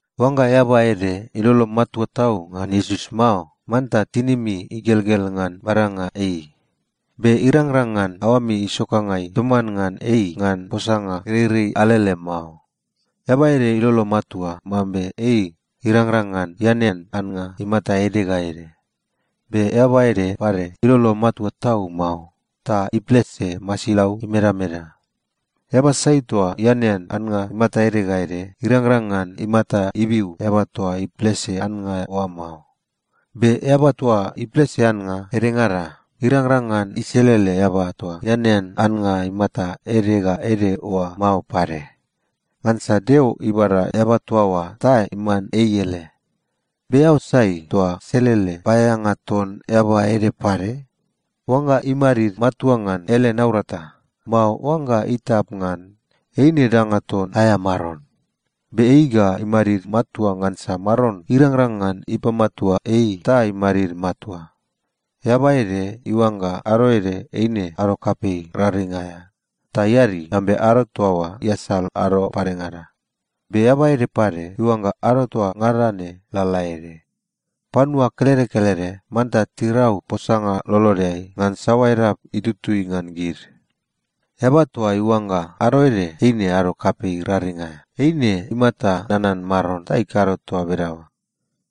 Oangga eaba ede ilolo matua tau ngan Iesus mao, manta tinimi igelgel ngan badanga ei. Be irangrang ngan aoami isokangai toman ngan ei ngan posanga gereirei alele mao. Eaba ede ilolo matua mambe ei irangrang ngan ianean annga imata ede ga ede. Be eaba ede pade ilolo matua tau mao, ta iplese masilau imedameda. Eaba sai toa ianean annga imata ede ga ede, irangrang ngan imata ibiu eaba toa iplese annga oa mao. Be eaba toa iplese annga edengada, irangrang ngan iselele eaba toa ianean annga imata ede ga ede oa mao pade. Ngansa Deo ibada eaba toa oa ta iman ei ele. Be eao sai toa selele paeaeanga ton eaba ede pade? Oangga imadid matua ngan ele naurata, mao oangga itap ngan, eine danga ton aea maron. Be ei ga imadid matua ngansa Maron irangrang ngan ipamatua ei ta imadid matua. Eaba ede iuangga ado ede eine ado kapei raring aea ta iadi mambe ado toa oa iasal ado padengada. Be eaba ede pade iuangga ado toa ngada ne lalaede. Panua kelede kelede manta tirau posanga lolodeai ngan saoa edap itutui ngan gid. Eaba toa iuangga ado ede eine ado kapei raring aea, eine imata nanan Maron ta ikado toa bedaoa.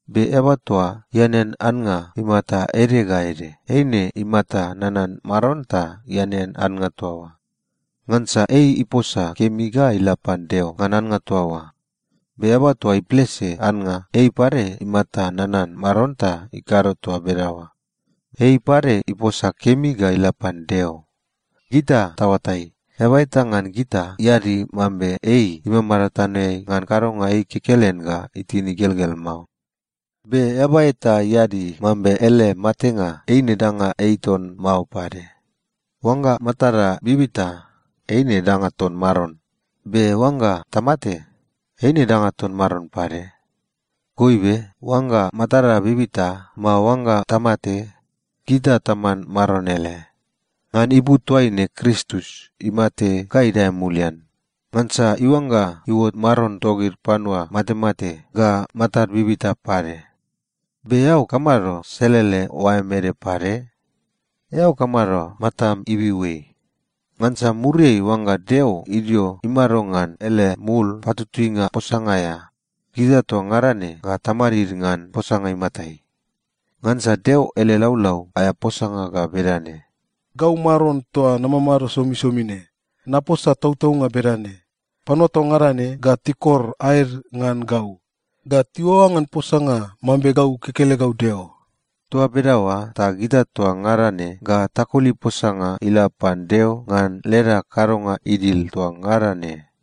Be eaba toa ianean annga imata ede ga ede, eine imata nanan Maron ta ianean annga toa oa. Ngansa ei iposa kemi ga ila pan Deo ngan annga toa oa. Be eaba toa iplese annga, ei pade imata nanan Maron ta ikado toa bedaoa. Ei pade iposa kemi ga ila pan Deo. Gita taoatai, eaba eta ngan gita iadi mambe ei imamado tanoeai ngan kadonga ei kekelen ga itin igelgel mao. Be eaba eta iadi mambe ele matenga eine danga ei ton mao pade. Oangga matada bibita, eine danga ton Maron. Be oangga tamate, eine danga ton Maron pade. Goibe oangga matada bibita, mao oangga tamate, gita taman Maron ele. Ngan ipu toaine Kristus imate ga idae mulian. Ngansa iuangga iuot Maron togid panua matemate ga matad bibita pade. Be eao kamado selele oaem ede pade? Eao kamado matam ibiu ei? Ngansa muriai oangga Deo idio imado ngan ele mul patutuinga posanga aea, gita toa ngada ne ga tamadid ngan posanga imatai. Ngansa Deo ele laulau aea posanga ga bedane, “Gau Maron toa namamado somisomi ne, naposa tautaunga bedane: Panua toa ngada ne ga tikor aed ngan gau, ga tiuaoa ngan posanga mambe gau kekelegau Deo.” Toa bedaoa ta gita toa ngada ne ga takoli posanga ila pan Deo ngan leda kadonga idil toa ngada ne.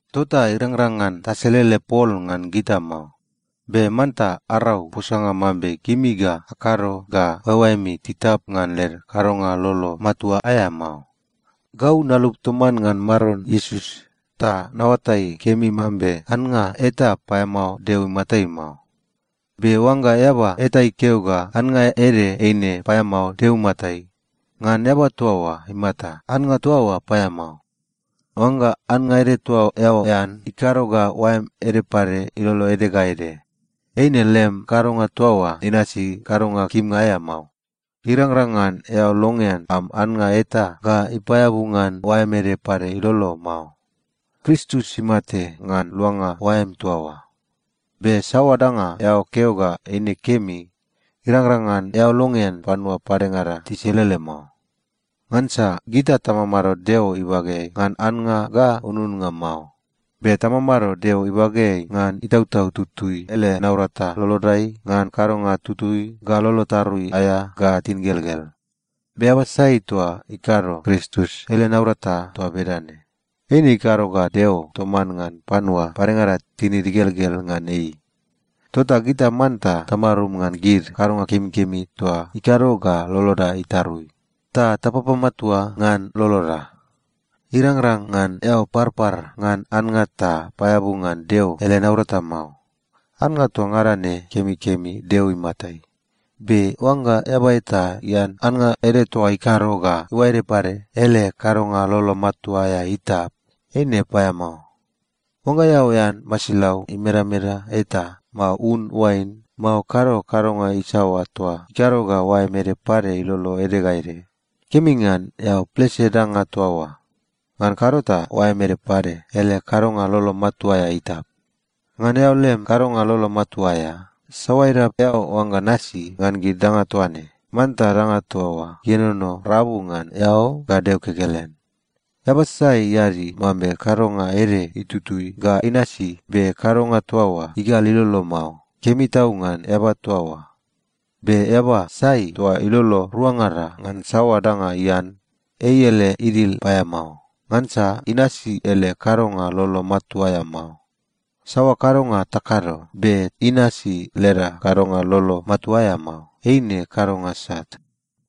Tota irangrang ngan taselele pol ngan gita mao. Be manta arau posanga mambe gimi ga akado ga oaeoaemi titap ngan led kadonga lolo matua aea mao. Gau nalup toman ngan Maron Iesus ta naoatai kemi mambe annga eta paeamao Deo imatai mao. Be oangga eaba eta ikeo ga annga ede eine paeamao Deo imatai, ngan eaba toa oa imata, annga toa oa paeamao. Oangga annga ede toa eao ean ikado ga oaem ede pade ilolo ede ga ede, eine lem kadonga toa oa inasi kadonga kimnga aea mao. Irangrang ngan eao longean am annga eta ga ipaeabu ngan oaem ede pade ilolo mao. Kristus imate ngan luanga oaem toa oa. Be saoa danga eao keo ga eine kemi, irangrang ngan eao longean panua padengada tiselele mao. Ngansa gita tamamado Deo ibageai ngan annga ga ununnga mao, be tamamado Deo ibageai ngan Itautau Tutui ele naurata lolodai ngan kadonga tutui ga lolo tarui aea ga tingelgel. Be eaba sai toa ikado Kristus ele naurata toa bedane, eine ikado ga Deo toman ngan panua padengada tinid igelgel ngan ei. Tota gita manta tamarum ngan gid kadonga kemikemi toa ikado ga loloda itarui, ta tapapamatua ngan loloda. Irangrang ngan eao parpar ngan annga ta paeabu ngan Deo ele naurata mao. Annga toa ngada ne kemikemi Deo imatai. Be oangga eaba eta ian annga ede toa ikado ga iuae ede pade ele kadonga lolo matua aea itap, eine paeamao. Oangga eao ean masilau imedameda eta, mao un oain, mao kado kadonga isaoa toa ikado ga oaem ede pade ilolo ede ga ede, kemi ngan eao plese danga toa oa. Ngan kado ta oaem ede pade ele kadonga lolo matua aea itap. Ngan eao lem kadonga lolo matua aea, saoa edap eao oangga nasi ngan gid danga toa ne, manta danga toa oa ienono rabu ngan eao ga Deo kekelen. Eaba sai iadi mambe kadonga ede itutui ga inasi, be kadonga toa oa igal ilolo mao, kemi tau ngan eaba toa oa. Be eaba sai toa ilolo ruangada ngan saoa danga ian, ei ele idil paeamao, ngansa inasi ele kadonga lolo matua aea mao. Saoa kadonga takado, be inasi leda kadonga lolo matua aea mao, eine kadonga sat.